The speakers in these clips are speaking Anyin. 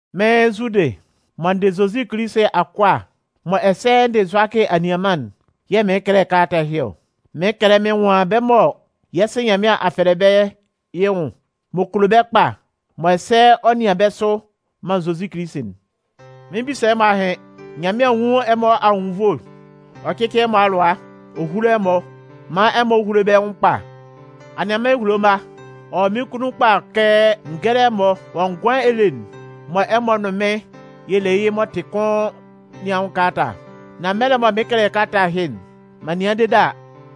Mɩ́n Zudɩ mɔ n dɩ Zozi Kilisi akʋa mɔ ɛsɛ n dɩ Zʋakɩ anianman'n yɛ̂ mɩɩn kɛlɛ kalata ɛhɩ ɔ. Mɩɩn kɛlɛ mɩn nwan bɛ́ mɔ yɛ́ Sɩ Nyanmɩan a fɛlɛ bɛ́ yɩ́ nwʋn, m'ɔ kulo bɛ́ kpa, mɔ ɛsɛ ɔ nɩan bɛ́ sʋ man Zozi Kilisi'n. Mɩn 'bisa ɛmɔ ahɩn. Nyanmɩan nwún ɛmɔ anwʋn anwunnvoe ɔ cɩ́cɩ ɛmɔ alʋa ɔ húlo ɛmɔ, man ɛmɔ húlo bɛ́ nwʋn kpa. Anianman ehulo mma, ɔ wɔ mɩ́n kunnun kpa kɛ n gɛ́lɛ ɛmɔ wɔ ngʋan ele'n mɔ ɛmɔ nʋn mɩ́n yɛ le yɩ́ m'ɔ tɩ kʋn nɩn anwʋn kalata. Nan mɛlɛ mɔ mɩn 'kɛlɛ kalata ɛhɩ'n, m'an nɩan dede a,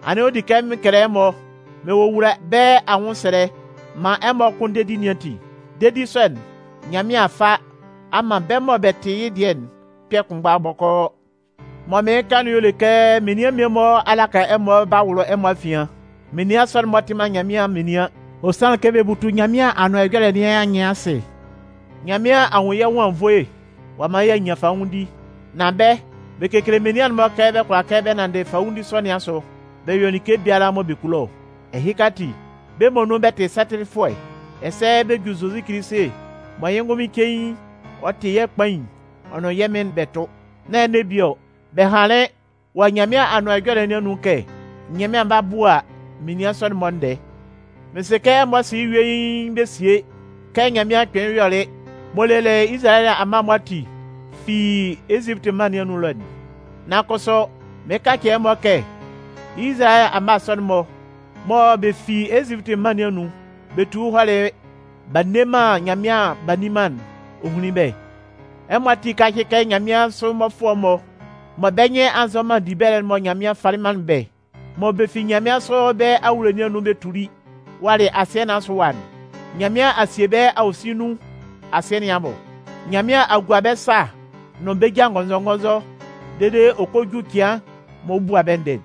anɩn ɔ di kɛ mɩn kɛlɛ ɛmɔ mɩn wowula bɛ́ anwʋnsɛlɛ maan ɛmɔ kʋn dedi nɩn ati. Dedi sɔ'n, Nyanmɩan a fa a man bɛ́ mɔ bɛ tɩ yɩ́ dɩɛ'n kpɛ̂ kpʋnmgba bɔkɔɔ. Mɔ mɩɩn kan'n y'ɔ le kɛ menian mmie-mɔ a laka ɛmɔ b'a wʋlʋ ɛmɔ afian. Menian sɔ'n-mɔ tɩ man Nyanmɩan menian. Ɔ sanlɩn kɛ bɛ butu Nyanmɩan Anʋan Ɛjɔlɛ nɩn anyɩn asɩ. Nyanmɩan a nwun yɛ́ nwʋn anwunnvoe ɔ'a man y'a nyan fanwʋndi. Nan bɛ́, bɛ kekele menian'n-mɔ kɛ bɛ kʋala kɛ bɛ nanndɩ fanwʋndi sɔ nɩn asʋ bɛ yɔ like biala mɔ bɛ kulo ɔ. Ɛhɩka ati, bɛ́ muonun bɛ tɩ satɩlɩfʋɛ, ɛsɛ bɛ ju Zozi Kilisi mɔ yɩ́ ngʋnmɩn cein ɔ tɩ yɛ́ Kpain ɔ nʋn yɛ́ Mɩn'n bɛ tʋ. Nán ɛnɛ bie ɔ, bɛ hanlɩn wɔ Nyanmɩan Anʋan Ɛjɔlɛ nɩn anun kɛ Nyanmɩan 'ba bua menian sɔ'n-mɔ ndɛɛ. Mɩn sɩ kɛ ɛmɔ sɩ yɩ́ yuein bɛ sie kɛ Nyanmɩan kpɩnlɩn yɔlɩ m'ɔ lelɩ Izalayɛ amma'n-mɔ ati fi Ezipiti mân nɩn anun ɛlɔ'n. Nan kʋsʋ, mɩɩn kacɩ ɛmɔ kɛ Izalayɛ amma sɔ'n-mɔ mɔ bɛ fi Ezipiti mân nɩn anun bɛ tuli hɔlɩ mɔ b'a nne man Nyanmɩan b'a nni man'n, ɔ hunlin bɛ́. Ɛmɔ ati kácɩ kɛ nyanmɩansʋ mmɔfʋɛ'n-mɔ mɔ bɛ́ nyɩn a nzɔ man dibɛlɛ'n mɔ Nyanmɩan falɩ manlɩn bɛ́, mɔ bɛ fi nyanmɩansʋ bɛ́ awulo nɩn anun bɛ tuli walɩ asɩɛ nɩn asʋ ɛwa'n, Nyanmɩan a sie bɛ́ awosin nun asɩɛ nɩn abʋ. Nyanmɩan a gua bɛ́ sa nʋn bɛ́ ja ngɔnzɔngɔnzɔ dede ɔ kɔ ju cɩan mɔ ɔ 'bua bɛ́ ndɛɛ.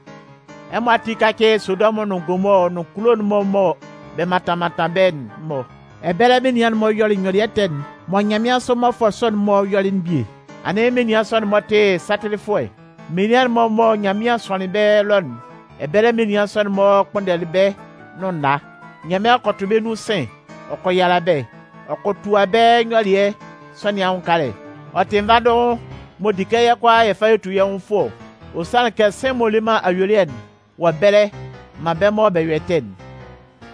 Ɛmɔ ati kácɩ Sodɔmʋn nʋn Gomɔɔ nʋn kulo'n-mɔ mɔ bɛ mantan mantan bɛ́'n-mɔ. Ɛbɛlɛ menian'n-mɔ yɔlɩ nyɔlɩɛ ɛtɛ'n mɔ nyanmɩansʋ mmɔfʋɛ sɔ'n-mɔ yɔlɩ'n bie. Anɩn menian sɔ'n-mɔ tɩ satɩlɩfʋɛ. Menian'n-mɔ mɔ Nyanmɩan sʋanlɩn bɛ́ ɛlɔ'n, ɛbɛlɛ menian sɔ'n-mɔ kpʋnndɛlɩ bɛ́ nʋn nna. Nyanmɩan kɔ tʋ bɛ́ nun sɩ̂n ɔ kɔ yala bɛ́ ɔ kɔ tua bɛ́ nyɔlɩɛ sɔ nɩn anwʋn kalɛ. Ɔ tɩ nvandʋhʋn m'ɔ di kɛ yɛ́ kʋalaa yɛ fa yɛ tu yɛ́ nwʋn fʋɔ ɔ. Ɔ sanlɩn kɛ sɩ̂n m'ɔ le man ayuelɩɛ'n wɔ ɛbɛlɛ man bɛ́ mɔ bɛ yɔ ɛtɛ'n.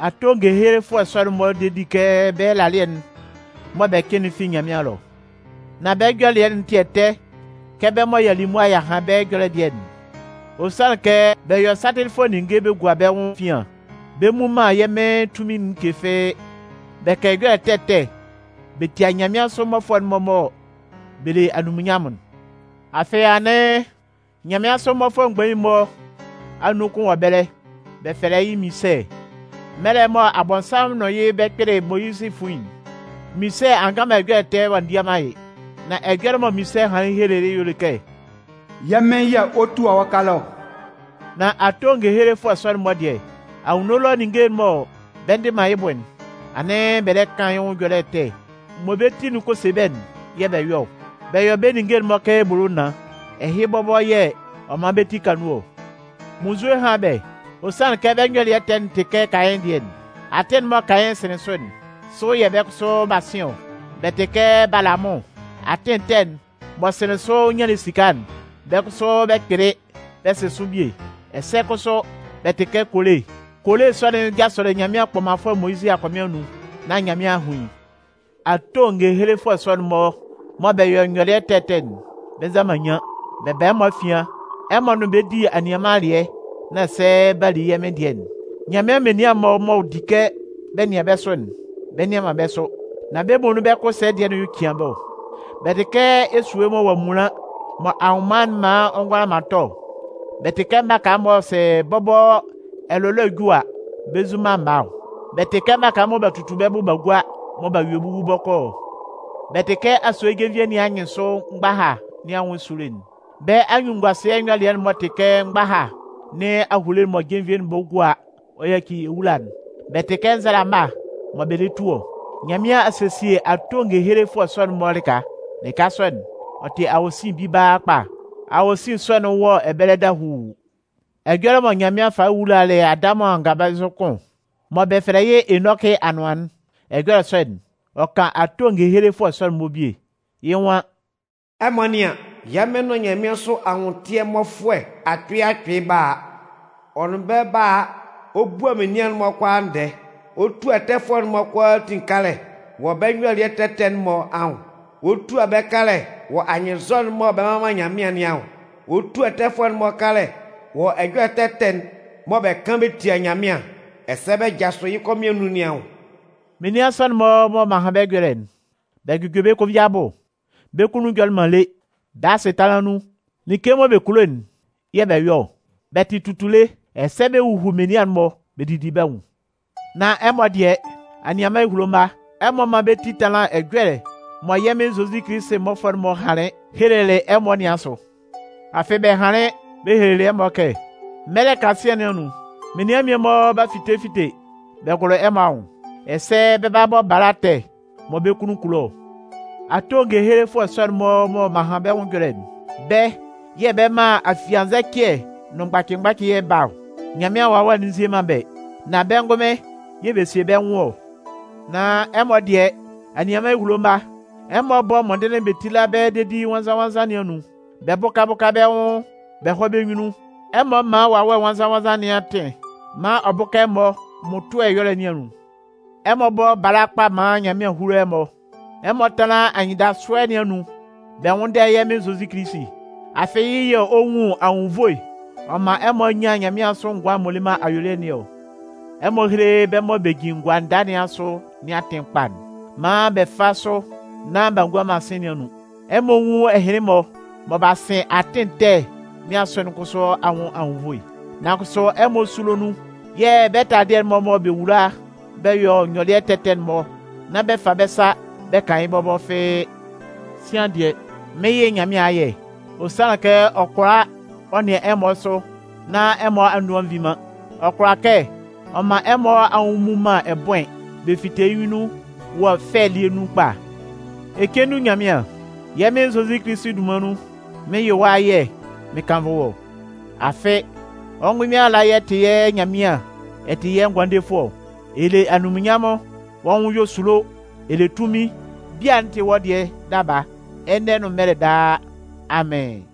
Ato ngehelefʋɛ sɔ'n-mɔ de di kɛ bɛ́ ɛlalɩɛ'n mɔ bɛ cɩn'n fi Nyanmɩan ɛlɔ. Nan bɛ́ nyɔlɩɛ'n tɩ ɛtɛ kɛ bɛ́ mɔ y'a li mʋa y'a han bɛ́ ɛjɔlɛ'n dɩɛ'n. Ɔ sanlɩn kɛ bɛ yɔ satɩlɩfʋɛ ninnge bɛ gua bɛ́ nwʋn efian. Bɛ mmu man yɛ́ Mɩn tunmin'n like fɩ́ɩ́. Bɛ kan ɛjɔlɛ ɛtɛ ɛtɛ bɛ tia nyanmɩansʋ mmɔfʋɛ'n-mɔ mɔ bɛ le anunminnyanmʋn'n. Afɩ anɩn, nyanmɩansʋ mmɔfʋɛ mgbain'n-mɔ anun kʋn wɔ ɛbɛlɛ, bɛ fɛlɛ yɩ́ Minsɛ. Mɛlɛ mɔ Abɔnsanmʋn nʋn yɩ́ bɛ 'kpɩlɩ Moyizɩ fuin'n, Minsɛ a ngan ɛjɔlɛ ɛtɛ ɔ'a ndia man yɩ́. Nan ɛjɔlɛ mɔ Minsɛ hanlɩn helelɩ yɩ́'n y'ɔ le kɛ: “Yɛ́ Mɩn yɛ̂ ɔ 'tua wɔ́ kalɛ ɔ!” Nan ato ngehelefʋɛ sɔ'n-mɔ dɩɛ, anwunno ɛlɔ ninnge'n mɔ bɛ ndɩ man yɩ́ bʋ'n, anɩn bɛ lɛ kan yɩ́ nwʋn ɛjɔlɛ ɛtɛ. Mɔ bɛ́ ti'n kɔ se bɛ́'n yɛ̂ bɛ yɔ ɔ. Bɛ yɔ bɛ́ ninnge'n-mɔ kɛ ebolo naan. Ɛhɩ bɔbɔ yɛ̂ ɔ 'man bɛ́ ti ka nun ɔ. Munnzue hán bɛ́! Ɔ sanlɩn kɛ bɛ́ nyɔlɩɛ ɛtɛ'n tɩ kɛ Kayɩn dɩɛ'n. Atɩn'n mɔ Kayɩn sɩnlɩn sʋ'n, sʋ yɛ̂ bɛ́ kʋsʋ b'a sɩn ɔ. Bɛ tɩ kɛ Balamʋn. Atɩn ɛtɛ'n m'ɔ sɩnlɩn sʋ ɔ nyanlɩn esika'n, bɛ́ kʋsʋ bɛ kpɩlɩ bɛ sɩn sʋ bie. Ɛsɛ kʋsʋ, bɛ tɩ kɛ Kole. Kole sɔ'n jasʋlɩ Nyanmɩan kpɔmanfʋɛ Moyizɩ akɔmɩn anun, nán Nyanmɩan a hun yɩ́. Ato ngehelefʋɛ sɔ'n-mɔ mɔ bɛ yɔ nyɔlɩɛ ɛtɛ ɛtɛ'n, bɛ nza man nyian. Bɛ ba ɛmɔ afian, ɛmɔ nʋn bɛ́ bɛ di anianman alɩɛ nán ɛsɛ b'a li yɛ́ Mɩn dɩɛ'n. Nyanmɩan menian'n-mɔ m'ɔ di kɛ bɛ nɩan bɛ́ sʋ'n, bɛ nnɩan man bɛ́ sʋ. Nan bɛ́ muonun bɛ́ kʋ ɛsɛ̂ dɩɛ'n y'ɔ cian bɛ́ ɔ. Bɛ tɩ kɛ esue mɔ ɔ'a munlan mɔ anwʋnman'n man ɔ'a ngʋla man tɔ ɔ. Bɛ tɩ kɛ mmaka mɔ sɛ bɔbɔ ɛlʋlɔɛ'n ju a, bɛ nzu man mma ɔ. Bɛ tɩ kɛ mmaka mɔ b'a tutu bɛ́ bʋ b'a gua mɔ b'a yue wu bɔkɔɔ ɔ. Bɛ tɩ kɛ asue jenvie nɩn anyɩnsʋ mgbaha nɩn anwʋn esulo'n. Bɛ́ anyunnunnguasɩɛ nyɔlɩɛ'n-mɔ tɩ kɛ mgbaha nɩn ahule'n mɔ jenvie'n bɔ gua ɔ yaci ewula'n. Bɛ tɩ kɛ nzalama mɔ bɛ lɛ tu ɔ. Nyanmɩan a sesie ato ngehelefʋɛ sɔ'n-mɔ lɩka. Lɩka sɔ'n, ɔ tɩ awosin bibaa kpa. Awosin sɔ'n wɔ ɛbɛlɛ dahuu. Ɛjɔlɛ mɔ Nyanmɩan falɩ wulalɩ Adamʋn anganbɛnzʋ kʋn mɔ bɛ fɛlɛ yɩ́ Enɔkɩ anʋan'n, ɛjɔlɛ sɔ'n, ɔ kan ato ngehelefʋɛ sɔ'n-mɔ bie. Yɩ́ nwan: “Ɛmɔ nɩ́an, yɛ́ Mɩn nʋn nyanmɩansʋ anwʋntɩɛ mmɔfʋɛ akpɩɩ akpɩɩ 'ba a. Ɔ nʋn bɛ́ 'ba a ɔ bua menian'n-mɔ kʋalaa ndɛɛ. Ɔ 'tua ɛtɛfʋɛ'n-mɔ kʋalaatin kalɛ wɔ bɛ́ nyɔlɩɛ ɛtɛ ɛtɛ'n-mɔ anwʋn. Ɔ 'tua bɛ́ kalɛ wɔ anyɩnnzɔ'n mɔ bɛ mman man Nyanmɩan nɩn anwʋn. Ɔ 'tua ɛtɛfʋɛ'n-mɔ kalɛ wɔ ɛjɔlɛ ɛtɛ ɛtɛ'n mɔ bɛ kan bɛ tia Nyanmɩan ɛsɛ bɛ jasʋ yɩ́ kɔmɩn anun nɩn anwʋn.” Menian sɔ'n-mɔ mɔ m'an han bɛ́ ɛjɔlɛ'n, bɛ jʋjɔ bɛ́ konvin abʋ, bɛ́ kunnun jɔlɩ man lé. Bɛ́ asɩtanlan nun, like mɔ bɛ kulo'n yɛ̂ bɛ yɔ ɔ. Bɛ tɩ tutule ɛsɛ bɛ huhu menian'n-mɔ bɛ didi bɛ́ nwʋn. Nan ɛmɔ dɩɛ, anianman ehulo mma, ɛmɔ mán bɛ́ ti tánlan ɛjɔlɛ'n mɔ yɛ́ Mɩn Zozi Kilisi mmɔfʋɛ'n-mɔ hanlɩn helelɩ ɛmɔ nɩn asʋ. Afɩ bɛ hanlɩn bɛ helelɩ ɛmɔ kɛ: “Mɛlɛ kasian nɩn anun, menian mmie-mɔ 'ba fite fite bɛ gʋlʋ ɛmɔ anwʋn, ɛsɛ bɛ 'bɔ bala ɛtɛ mɔ bɛ́ kunnun kulo ɔ.” Ato ngehelefʋɛ sɔ'n-mɔ mɔ m'an han bɛ́ ɛjɔlɛ'n, bɛ́ yɛ̂ bɛ man afiannzɛcɩɛ nʋn mgbacɩ-mgbacɩɛ'n ba ɔ. Nyanmɩan Wawɛ'n nzie man bɛ́, nan bɛ́ ngʋnmɩn yɛ̂ bɛ sie bɛ́ nwʋn ɔ. Nan ɛmɔ dɩɛ, anianman ehulo mma, ɛmɔ bɔ́ mɔndɩnlɩn bɛ tíla bɛ dedi nwannzan-nwannzan nɩn anun bɛ bʋ́ka bʋ́ka bɛ́ nwʋn bɛ hɔ́ bɛ́ nyunnun. Ɛmɔ mán Wawɛ Nwannzan-nwannzan nɩn atɩn maan ɔ bʋ́ka ɛmɔ mmʋtʋɛ ɛyɔlɛ nɩn anun. Ɛmɔ bɔ́ bala kpa maan Nyanmɩan húlo ɛmɔ. Ɛmɔ tánlan anyɩndasʋɛ nɩn anun bɛ nwʋ́nndɛ yɛ́ Mɩn Zozi Kilisi. Afɩ yɩ́ yɛ̂ ɔ 'nwun anwunnvoe ɔ man ɛmɔ nyan nyanmɩansʋ ngʋan'n m'ɔ le man ayuelɩɛ nɩn ɔ. Ɛmɔ héle bɛ́ mɔ bɛ jin gua nda nɩn asʋ nɩn atɩn kpa'n maan bɛ fá sʋ nán b'a ngua man sɩ̂n nɩn anun. Ɛmɔ nwún ɛhɩnlɩn-mɔ mɔ b'a sɩn atɩn ɛtɛ nɩn asʋ'n kʋsʋ anwʋn anwunnvoe. Nan kʋsʋ ɛmɔ súlo nun yɛ̂ bɛ́ taladɩɛ'n-mɔ mɔ bɛ wula bɛ yɔ bɛ́ nyɔlɩɛ ɛtɛ ɛtɛ'n-mɔ'n, nán bɛ fa bɛ́ sa bɛ kan yɩ́ bɔbɔ fɩ́ɩ́. Sian dɩɛ, mɩn 'yɩ Nyanmɩan ayɛ. Ɔ sanlɩn kɛ ɔ kʋala ɔ nɩan ɛmɔ sʋ nán ɛmɔ a ndu a nvin man. Ɔ kʋala kɛ ɔ man ɛmɔ anwʋn mmu man ɛbʋɩn bɛ fite yɩ́ nyunnun wɔ fɛ elie nun kpa. Ecendu Nyanmɩan, yɛ́ Mɩn Zozi Kilisi dunman nun, mɩn 'yɩ wɔ́ ayɛ mɩn kannvʋ wɔ́. Afɩ, wɔ́ ngʋnmɩn ala y'ɛ tɩ yɛ́ Nyanmɩan ɛ tɩ yɛ́ Ngʋandefʋɛ ɔ. Ɛ le anunminnyanmʋn, wɔ́ nwʋn yɔ esulo, ɛ le tunmin. Bia'n tɩ wɔ́ dɩɛ daba, ɛnɛ nʋn mɛlɛ daa! Amɩn.